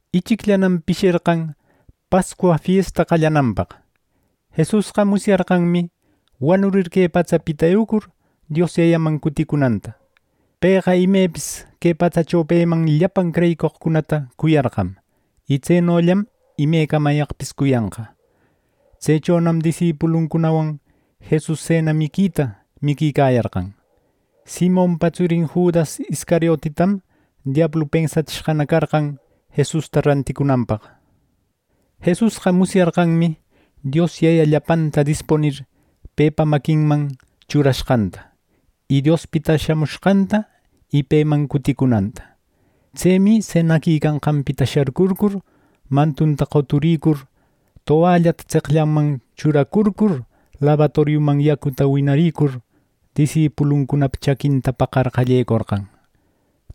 Ichicllanam pisherqan Pascua fiesta qallananpaq. Jesusqa musyarqanmi wanurir que patsapita eucur Dios Yayaman cuticunanta. Pëqa imepis que patsacho peman llapan creyicoqcunata cuyarqam y tsenollam imecamayaqpis cuyanqa. Tsechonam disipuluncunawan Jesus sena miquita miquicayarqan. Simonpa tsurin Judas Iscariotitam diablu pensatsishqana carqan Jesusta ranticunanpaq. Jesusqa musyarqanmi Dios Yaya llapanta dispunir pepa maquinman churashqanta, y Diospita shamushqanta y peman cuticunanta. Tsemi senaquicanqanpita sharcurcur, mantunta qoturicur, towallata tseqllanman churacurcur, labatoriuman yacuta winaricur, disipuluncunapa chaquinta paqar qallecorqan,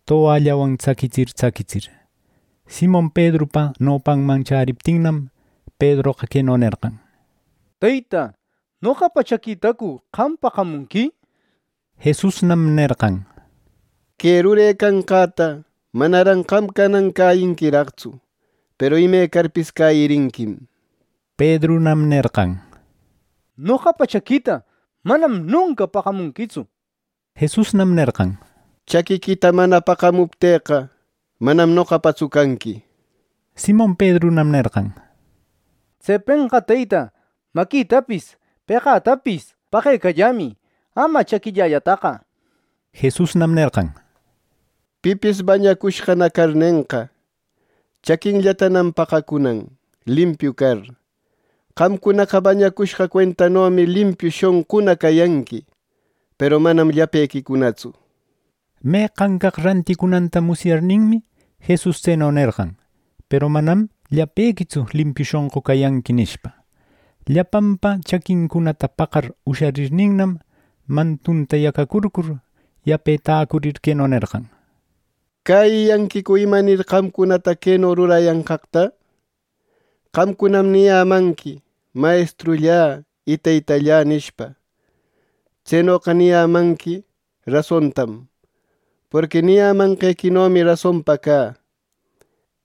towallawan tsaquitsir tsaquitsir. Simon Pedrupa nopanman chäriptinnam, Pedroqa queno nerqan: —Teyta, ¿noqapa chaquitacu qam paqamunqui! —nir. Jesusnam nerqan: —Que rurecanqäta manaran qam canan cäyinquiraqtsu; peru imecarpis cäyirinquim —nir. Pedrunam nerqan: —¡Noqapa chaquïta manam nunca paqamunquitsu! —nir. Jesusnam nerqan: —Chaquiquita mana paqamupteqqa, manam noqapatsu canqui —nir. Simon Pedrunam nerqan: —Tsepenqa Teyta, maquitapis peqätapis paqecallämï; ama chaquillällataqa —nir. Jesusnam nerqan: —Pipis bañacushqana carnenqa, chaquinllatanam paqacunan, limpiu car. Qamcunaqa bañacushqa cuentanomi limpiu shonquna cayanqui. Peru manam llapequicunatsu. Meqan caq ranticunanta musyarninmi, Jesus tseno nerqan: “Peru manam llapequitsu limpiu shonqu cayanqui” nishpa. Llapanpa chaquincunata paqar usharirninnam, mantunta yacacurcur, yape täcurir queno nerqan: —¿Cäyiyanquicu imanir qamcunata queno rurayanqaqta? Qamcunam niyämanqui: ‘Mayestrullä y Teytallä’ nishpa. Tsenoqa niyämanqui rasontam, porqui niyämanqequinomi rasonpa cä.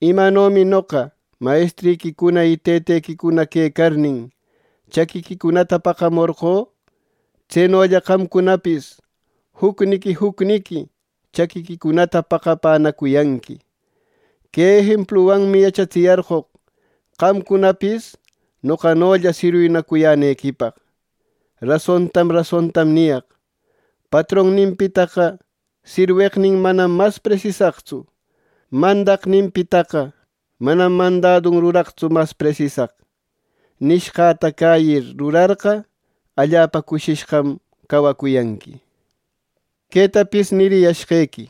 Imanomi noqa mayestriquicuna y tëtequicuna quecarnin, chaquiquicunata paqamorqö, tsenolla qamcunapis jucniqui jucniqui chaquiquicunata paqapänacuyanqui. Que ejempluwanmi yachatsiyarqoq qamcunapis, noqanolla sirwinacuyänequipaq. Rasontam rasontam niyaq: Patronninpitaqa sirweqnin manam mas presisaqtsu; mandaqninpitaqa manam mandadun ruraqtsu mas presisaq. Nishqäta cäyir rurarqa, allapa cushishqam cawacuyanqui. “Quetapis niriyashqequi;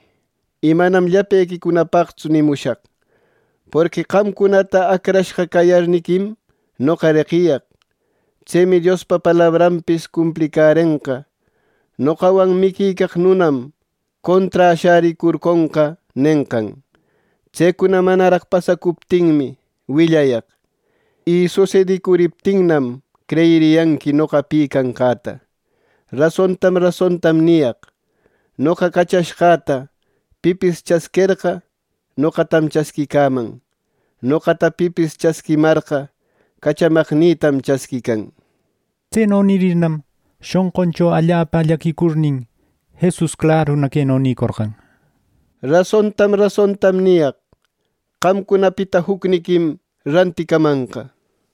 y manam llapequipaqtsu nimushaq, porqui qamcunata acrashqa cayarniquim noqa reqiyaq. Tsemi Diospa palabranpis cumplicärenqa: ‘Noqawan miquicaq nunam conträ shäricurconqa’ nenqan. Tsecuna manaraq pasacuptinmi, willayaq. Y susedicuriptinnam, creyiriyanqui noqa pi canqäta. Rasontam rasontam niyaq: Noqa cachashqäta pipis chasquerqa, noqatam chasquicaman. Noqata pipis chasquimarqa, cachamaqnïtam chasquican” nir. Tseno nirirnam, shonquncho allapa llaquicurnin, Jesus claruna queno nïcorqan: —Rasontam rasontam niyaq: Qamcunapita jucniquim ranticamanqa.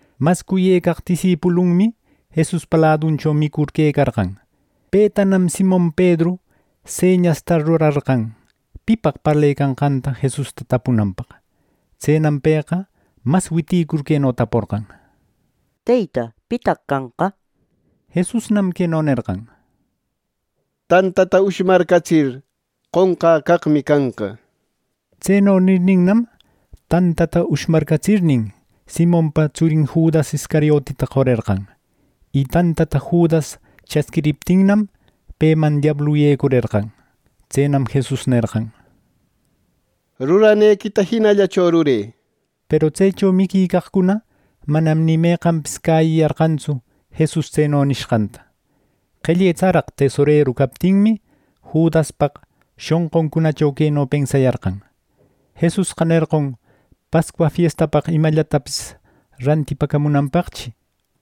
Mas cuyë caq disipulunmi Jesuspa laduncho micur quecarqan. Petanam Simon Pedru señasta rurarqan pipaq parlecanqata Jesusta tapunanpaq. Tsenam pëqa mas witïcur, queno taporqan: —Teyta, ¿Pitaq canqa? —nir. Jesusnam queno nerqan: —Tantata ushmaratsir, qonqä caqmi canqa —nishpa. Tseno nirninnam, tantata ushmaratsirnin, Simonpa tsurin Judas Iscariotita qorerqan. Y tantata Judas chasquiriptinnam, peman diablu yecurerqan. Tsenam Jesus nerqan: —Ruranequita jinallacho rurë. Peru tsecho miquicaqcuna manam ni meqanpis cäyiyarqantsu Jesus tseno nishqanta. Qelle tsaraq tesoreru captinmi, Judaspaq shonquncunacho queno pensayarqan: “Jesusqa nerqon Pascua fiestapaq imallatapis rantipäcamunanpaqchi”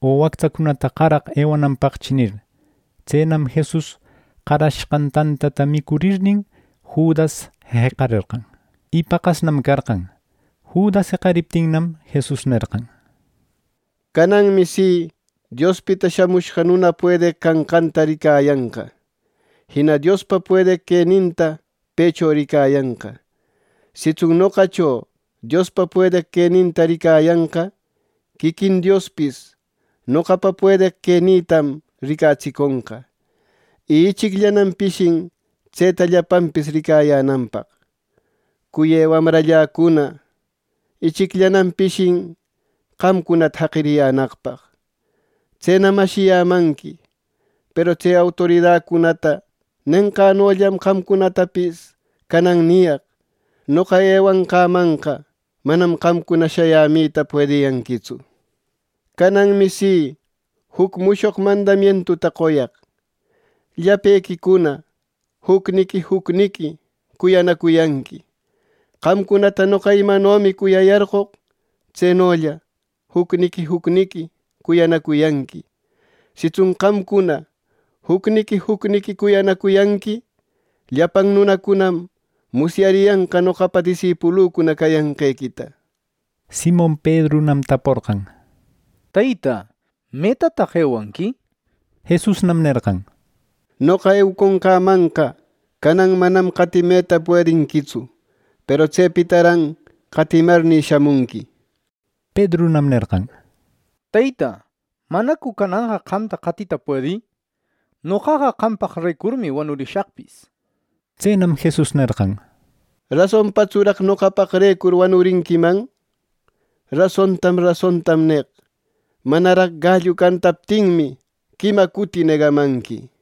o “wactsacunata qaraq ewananpaqchi” nir. Tsenam Jesus qarashqan tantata micurirnin, Judas jeqarerqan. Y paqasnam carqan. Judas jeqariptinnam, Jesus nerqan: —Cananmi si Diospita Shamushqa Nuna puedeq canqanta ricayanqa. Jina Diospa puedeq queninta pëcho ricayanqa. Sitsun noqacho Diospa puedeq queninta ricayanqa, quiquin Diospis noqapa puedeq quenïtam ricatsiconqa. Y ichicllanam pishin tseta llapanpis ricayänanpaq. Cuyë wamralläcuna, ichicllanam pishin qamcunata jaqiriyänaqpaq. Tsenam ashiyämanqui peru tse autoridacunata nenqänollam qamcunatapis canan niyaq: Noqa ewanqämanqa manam qamcuna shayämita puediyanquitsu. Cananmi si juc mushoq mandamientuta qoyaq: Llapequicuna jucniqui jucniqui cuyanacuyanqui. Qamcunata noqa imanomi cuyayarqoq, tsenolla jucniqui jucniqui cuyanacuyanqui. Sitsun qamcuna jucniqui jucniqui cuyanacuyanqui, llapan nunacunam musyariyanqa noqapa disipulücuna cayanqequita. Simon Pedrunam taporqan: —Teyta, ¿metataq ewanqui? —nishpa. Jesusnam nerqan: —Noqa eucunqämanqa canan manam qatimeta puedinquitsu; peru tsepitaran qatimarnï, shamunqui —nir. Pedrunam nerqan: —Teyta, ¿manacu cananqa qamta qatita puedï? ¡Noqaqa qampaqrecurmi wanurishaqpis! —nir. Tsenam Jesus nerqan: —¿Rasonpatsuraq noqapaqrecur wanurinquiman? Rasontam rasontam neq: Manaraq gallu cantaptinmi, quima cuti negamanqui.